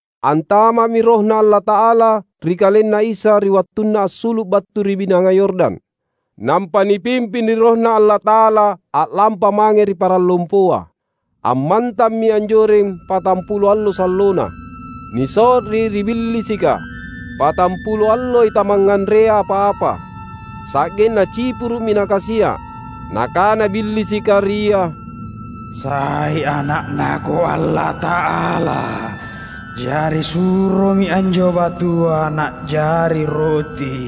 Antama’mi RohNa Allata’ala ri KalenNa Isa ri wattunna assulu’ battu ri Binanga Yordan. Nampa nipimping ri RohNa Allata’ala a’lampa mange ri parang lompoa. Ammantammi anjoreng patampulo allo sallona, niso’ri ri Billisika. Patampulo alloi tamangnganrea apa-apa. Sa’genna cipuru’mi Nakasia’. Nakana Billisika ri Ia, "Sai ana’NaKo Allata’ala? Jari suromi anjo batua na’jari roti."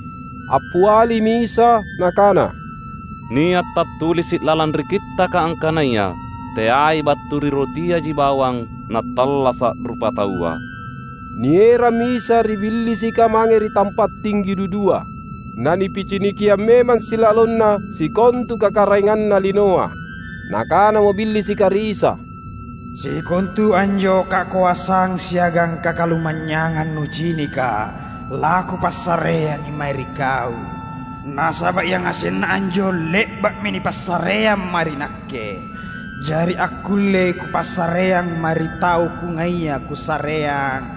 Appialimi Isa Nakana, "Nia’ tattulisi’ lalang ri Kittaka angkanaya, ‘Teai battu ri rotiaji bawang nattallasa’ rupataua.’" Nierammi Isa ri Billisika mange ri tampa’ tinggi dudua. Na nipicinikiang memang silalonna sikontu kakaraenganna linoa. Nakanamo Billisika ri Isa, "Sikontu anjo kakoasang siagang kakalumanynyangang Nucinika lakupassareangi mae ri Kau. Nasaba’ yangasenna anjo le’ba’mi nipassareang mae ri nakke. Jari akkullei kupassareang mae ri tau kungaia kusareang.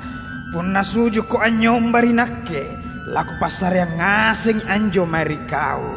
Punna su’jukKo anynyomba ri nakke lakupassareang ngasengi anjo mae ri Kau."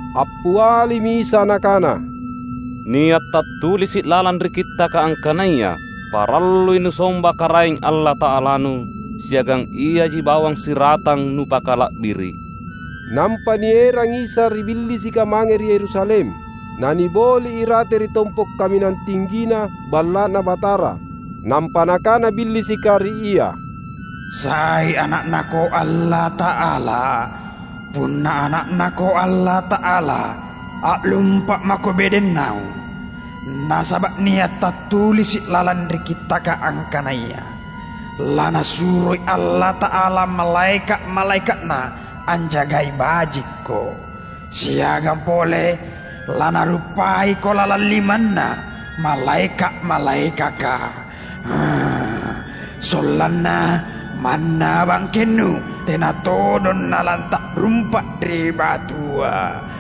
Appialimi Isa Nakana, "Nia’ tattulisi’ lalang ri Kittaka angkanaya, ‘Parallui nusomba Karaeng Allata’alanu, siagang Iaji bawang siratang nupakala’biri’!’" Nampa nierang Isa ri Billisika mange ri Yerusalem, na niboli’ irate ri tompo’ kaminang tinggina Balla’Na Batara. Nampa nakana Billisika ri Ia, "Sai Ana’NaKo Allata’ala? Punna Ana’NaKo Allata’ala, a’lumpa’ mako bedeng naung. Nasaba’ nia’ tattulisi’ lalang ri Kittaka angkanaya, ‘LaNasuroi Allata’ala malaeka’-malaeka’Na anjagai bajikKo.’ Siagang pole, ‘Lanaruppaiko lalang limanna malaeka’-malaekaka, sollanna manna bangkenNu tena todong nalata’rumpa’ ri batua.’"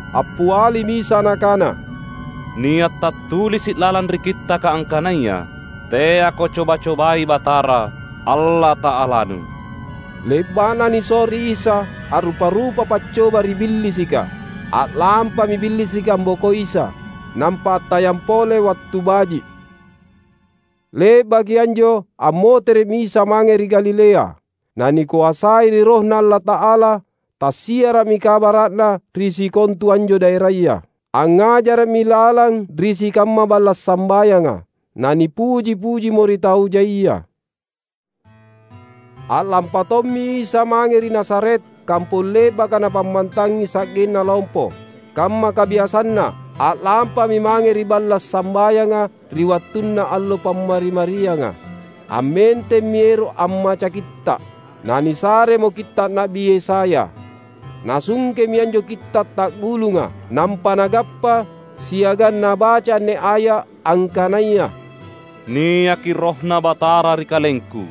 Appialimi Isa Nakana, "Nia’ tattulisi’ lalang ri Kittaka angkanaya, ‘Teako coba-cobai Batara, Allata’alanu.’" Le’ba’na niso’ri Isa a’rupa-rupa paccoba ri Billisika, a’lampami Billisika ambokoi Isa, nampa attayang pole wattu baji’. Le’baki anjo ammotere’mi Isa mange ri Galilea. Na nikoasai ri RohNa Allata’ala. Tassiara’mi kabara’Na ri sikontu anjo daeraya. Angngajara’mi lalang ri sikamma balla’ sambayanga. Na nipuji-pujimo ri tau jaia. A’lampa tommi Isa mange ri Nazaret, kampong le’baka Napammantangi sa’genna lompo. Kamma kabiasanNa, a’lampami mange ri balla’ sambayanga ri wattunna allo Pammari-marianga. Ammentemmi ero’ ammaca Kitta’. Na nisaremo kitta’ Na’bi Yesaya. Nasungkemi anjo kitta’ ta’gulunga, nampa Nagappa siagang Nabaca anne aya’ angkanaya, "Niaki RohNa Batara ri KalengKu,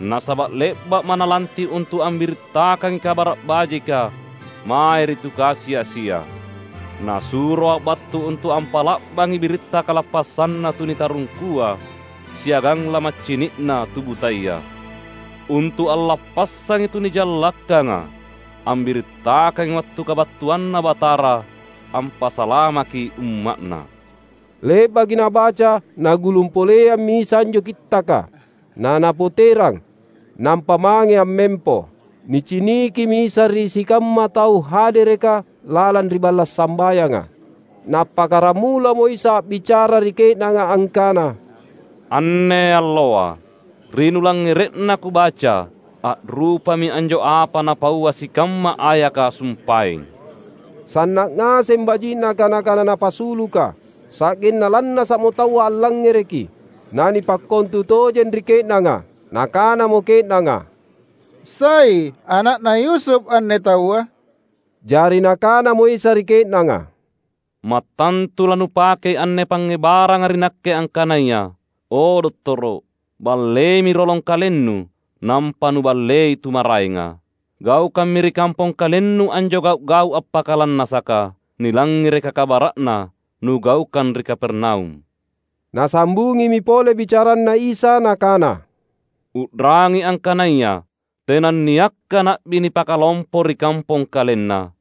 Nasaba’ le’ba’Ma’ Nalanti’ untu’ ambirittakangi Kabara’ Bajika mae ri tu kasi-asia. NasuroA’ battu untu’ ampa’la’bangi biritta kalappassanna tu nitarungkua siagang lamaccini’na tu butaya; untu’ allappassangi tu nijallakkanga ambirittakangi wattu kabattuanNa Batara ampasalamaki umma’Na." Le’baki Nabaca, Nagulung poleammi Isa anjo kittaka, naNapoterang, nampa mange ammempo. Nicinikimi Isa ri sikamma tau hadereka lalang ri balla’ sambayanga. Na appakkaramulamo Isa a’bicara ri ke’nanga angkana, "Anne alloa, ri nulangngere’na Kubaca, a’rupami anjo apa napaua sikamma ayaka sumpaeng." Sanna’ ngaseng baji’na kana-kana Napasuluka. Sa’genna lannasa’mo taua allangngereki, na nipakkontutojeng ri ke’nanga. Nakanamo ke’nanga, "Sai ana’na Yusuf anne Taua?" Jari Nakanamo Isa ri ke’nanga, "Mattantu lanupakei anne pangngebaranga ri Nakke angkanaya, ‘O dottoro’, balleimi rolong KalenNu, nampa Nuballei tu maraenga. Gaukammi ri kampong KalenNu anjo gau’-gau’ appakalannasaka, nilangngereka kabara’na Nugaukang ri Kapernaum.’" Nasambungimi pole bicaranNa Isa Nakana, "U’rangi angkanaya tenanniakka na’bi nipakalompo ri kampong kalenna.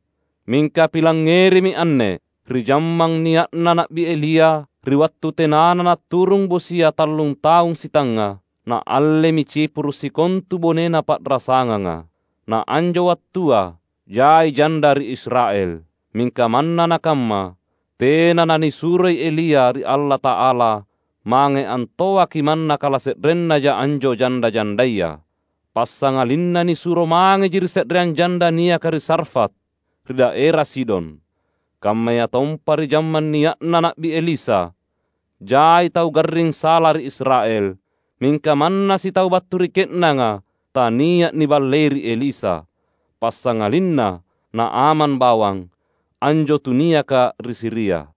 Mingka pilangngerimi anne: ri jammang nia’na Na’bi Elia, ri wattu tenana naturung bosia tallun taung sitangnga, naallemi cipuru’ sikontu bonena pa’rasanganga. Na anjo wattua jai janda ri Israel. Mingka manna nakamma, tena nanisuroi Elia ri Allata’ala mange antoaki manna kalase’rennaja anjo janda-jandaya. Passangalinna nisuro mangeji ri se’reang janda niaka ri Sarfat, ri daera Sidon. Kammayatompa ri jammang nia’na Na’bi Elisa, jai tau garring sala ri Israel. Mingka manna sitau battu ri ke’nanga tania’ niballei ri Elisa. Passangalinna Naaman bawang, anjo tu niaka ri Siria."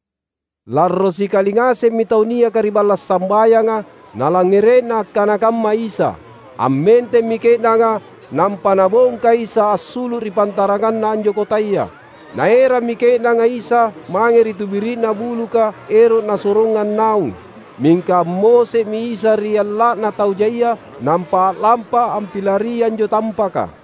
Larro sikali ngasemmi tau niaka ri balla’ sambayanga nalangngere’na akkana kamma Isa. Ammentemmi ke’nanga nampa nabongka Isa assulu’ ri pantaranganna anjo kotaya. Naerammi ke’nanga Isa mange ri tubiri’na buluka ero’ nasorongang naung. Mingka ammose’mi Isa ri alla’na tau jaia nampa a’lampa ampilari anjo tampaka.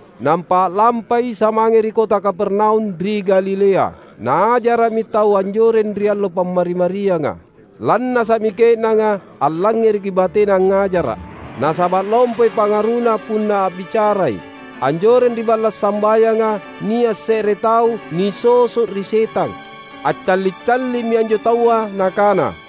Nampa a’lampa Isa mange ri kota Kapernaum ri Galilea. Naajara’mi taua anjoreng ri allo Pammari-marianga. Lannasa’mi ke’nanga allangngereki bateNa angngajara’, nasaba’ lompoi pangaruNa punna a’bicarai. Anjoreng ri balla’ sambayanga nia’ se’re tau nisoso’ ri setang. Accalli’-calli’mi anjo taua nakana,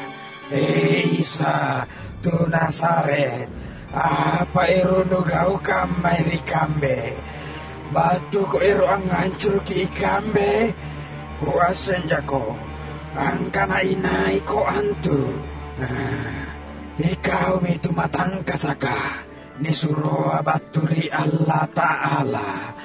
"He Isa, tu Nazaret! Apa ero’ Nugaukang mae ri kambe? BattuKo ero’ angngancuruki ikambe? KuassenjaKo angkana inaiKo antu: iKaumi tu matangkasaka, nisuroa battu ri Allata’ala!"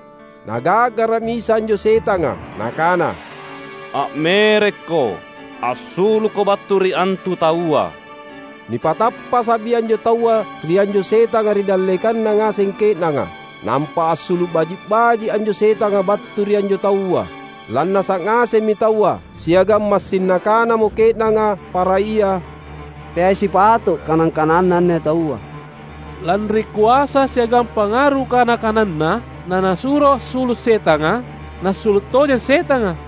Naga’gara’mi Isa anjo setanga Nakana, "A’merekko! Assulukko battu ri antu taua!" Nipatappasa’mi anjo taua ri anjo setanga ri dallekanna ngaseng ke’nanga. Nampa assulu’ baji’-baji’ anjo setanga battu ri anjo taua. Lannasa’ ngasemmi taua, siagang massing nakanamo ke’nanga para ia, "Teai sipato’ kana-kananNa anne taua. Lanri koasa siagang pangaru kana-kananNa na Nasuro assulu’ setanga, nassulu’ tojeng setanga!"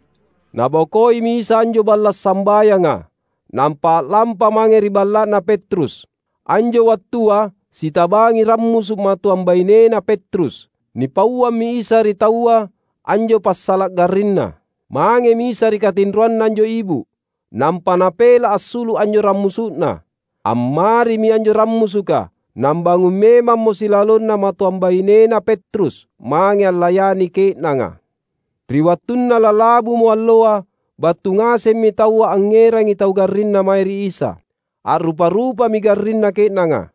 Nabokoimi Isa anjo balla’ sambayanga, nampa a’lampa mange ri balla’na Petrus. Anjo wattua sitabangi rammusu’ matoang bainena Petrus. Nipauammi Isa ri taua anjo passala’ garrinna. Mangemi Isa ri katinroanna anjo ibu’, nampa Napela’ assulu’ anjo rammusu’na. Ammarimi anjo rammusuka; nambangung memammo silalonna matoang bainena Petrus, mange allayani ke’nanga. Ri wattunna lalabumo alloa, battu ngasemmi taua angngerangi tau garrinna mae ri Isa. A’rupa-rupami garrinna ke’nanga.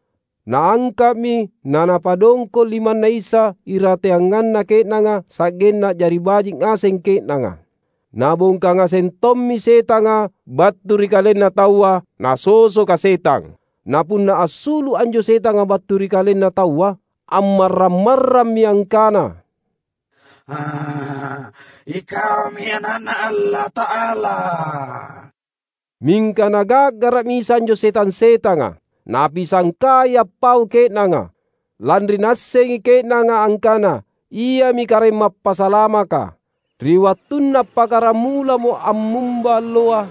Naangka’mi na Napadongko’ limanNa Isa irateanganna ke’nanga, sa’genna a’jari baji’ ngaseng ke’nanga. Nabongka ngaseng tommi setanga battu ri kalenna taua, nasosoka setang. Na punna assulu’ anjo setanga battu ri kalenna taua, ammarrang-marrammi angkana, "IKaumi Ana’Na Allata’ala!" Mingka Naga’gara’mi Isa anjo setang-setanga. Napisangkai appau ke’nanga, lanri naassengi ke’nanga angkana, Iami Karaeng Mappasalamaka. Ri wattunna appakkaramulamo ammumba alloa,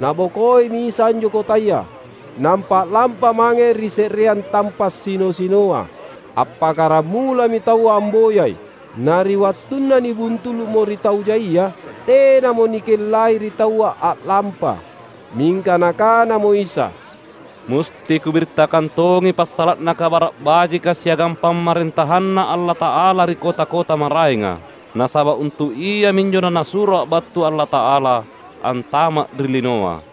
Nabokoimi Isa anjo kotaya, nampa a’lampa mange ri se’reang tampa’ sino-sinoa. Appakkaramulami taua amboyai. Na ri wattunna nibuntulu’mo ri tau jaia, tenamo nikellai ri taua a’lampa. Mingka Nakanamo Isa, "Musti Kubirittakang tongi passala’na Kabara’ Bajika siagang PamarentahanNa Allata’ala ri kota-kota maraenga. Nasaba’ untu’ iaminjo naNasuroA’ battu Allata’ala antama’ ri linoa."